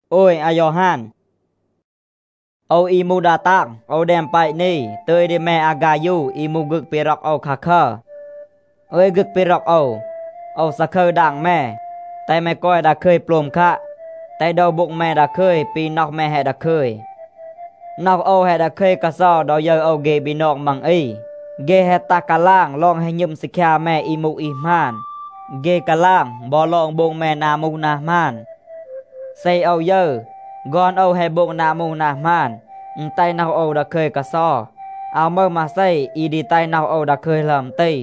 โอว อี มูห ดา ตาง, โอว แดม แปะ นี, ตึย ดี แม อาฆายู อี มูห ฆึก ปี ร็อก โอว คาคัร. อึย ฆึก ปี ร็อก โอว, โอว ซาคึร ดาง แม, แตห แม กอย ดาคึย โปลม คัะ. แตห โดว โบ็ง แม ดาคึย ปี น็อห แม แฮะ ดาคึย. น็อห โอว แฮะ ดาคึย กาเซา ดอ ยึร โอว เฆ บีนอง มัง อี, เฆ แฮะ ตัห กาลาง ลอง แฮะ หณึม ซีคยา แม อี มูห อี หมาน. เฆ กาลาง บอ ลอง โบง แม นา มูห นา หมาน. เซ โอว ยึร, ฆอน โอว แฮะ โบง นา มูห นา หมาน, อึณ แตห น็อห โอว ดาคึย กาเซา. อาว มึห มาเซ อี ดี แตห โอว ดาคึย หลึอม ตี.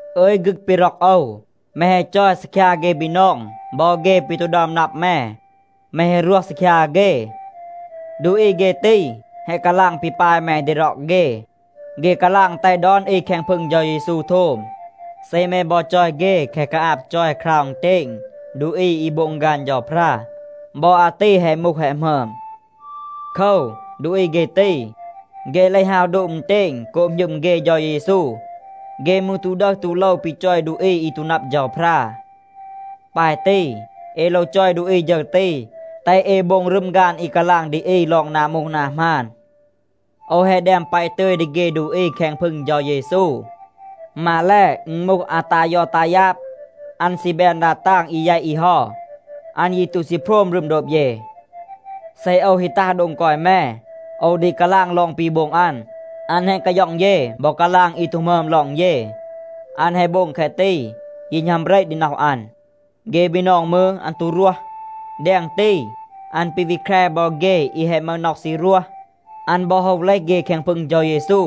อึย ฆึก ปี ร็อก โอว, แม แฮะ จอย ซีคยา เฆ บีนอง บอ เฆ ปี ตู ดึอม นับ แม. แม แฮะ รวห ซีคยา เฆ. ดูอี เฆ ตี แฮะ กาลาง ปี ปาย แม ดี ร็อก เฆ. เฆ กาลาง แตห ดอน อี แคง พึง เฌา เยซู โทม. เซ แม บอ จอย เฆ แคะ กาอาบ จอย คราว อึณเตณ ดูอี อี โบง ฆาน เฌาพรา, บอ อาตี แฮะ มูห แฮะ หมึอม. โคว, ดูอี เฆ ตี, เฆ เลห ฮาว โดบ อึณเตณ โกบ หณึม เฆ เฌา เยซู. เฆ มืร ตู ดึห ตู โลว ปี จอย ดูอี อี ตู นับ เฌาพรา. ปาย ตี, เอ โลว จอย ดูอี ฌึร ตี, แตห เอ โบง รึม ฆาน อี กาลาง ดี อี ลอง นา มูห นา หมาน. โอว แฮะ แดม แปะ ตึย ดี เฆ ดูอี แคง พึง เฌา เยซู. มาแล, อึณ มูห อาตายอตายาบ, อัน ซี แบน ดา ตาง อี แยต อี เฮา. อัน ยี ตู ซี โพรม รึม โดบ เย. เซ โอว ฮี ตัห โดง กอย แม, โอว ดี กาลาง ลอง ปี โบง อัน. อัน แฮะ กาย็อง เย บอ กาลาง อี ตู หมึอม ลอง เย. อัน แฮะ โบง แคะ ตี, ยี หณัม เบระ ดี น็อห อัน. เฆ บีนอง มืร, อัน ตู รวห. แดง ตี, อัน ปี วี แคร บอ เฆ อี แฮะ มึห น็อห ซี รวห. อัน บอ โฮว เลห เฆ แคง พึง เฌา เยซู.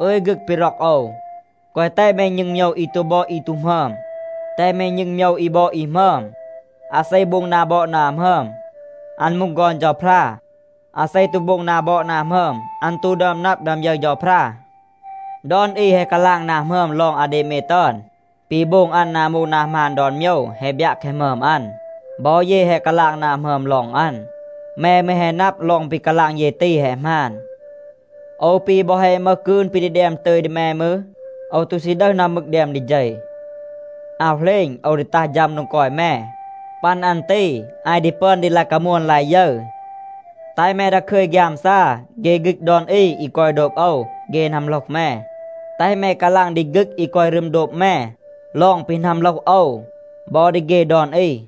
อึย ฆึก ปี ร็อก โอว, แกวะ แตห แม ณึง โมยว อี ตู บอด อี ตู หมึอม. แตห แม ณึง โมยว อี บอด อี หมึอม. อาเซ โบง นา บอด นา หมึอม, อัน มูห ฆอน เฌาพรา. อาเซ ตู โบง นา บอด นา หมึอม, อัน ตู ดึอม นับ, ดึอม ยึร เฌาพรา. ดอน อี แฮะ กาลาง นา หมึอม ลอง อาเดเมด ตึอน. ปี โบง อัน นา มูห นา หมาน ดอน โมยว แฮะ บยัะ แคะ หมึอม อัน. บอ เย แฮะ กาลาง นา หมึอม ลอง อัน. แม มืร แฮะ นับ, ลอง ปี กาลาง เย ตี แฮะ หมาน. โอว ปี บอ แฮะ มึห กืน ปี ดี แดม ตึย ดี แม มืร, โอว ตู ซี ดึห อึม มึก แดม ดี เฌ. อาว เหลณ โอว ดี ตัห ฌัม โดง กอย แม. ปัน อัน ตี, อาย ดี ปึอน ดี ลาย กามวน ลาย ยึร. แตห แม ดาคึย ฆยามซา. เฆ ฆึก ดอน อี อี กอย โดบ โอว, เฆ นัมโหลห แม. แตห แม กาลาง ดี ฆึก อี กอย รึม โดบ แม ลอง ปี นัมโหลห โอว บอ ดี เฆ ดอน อี.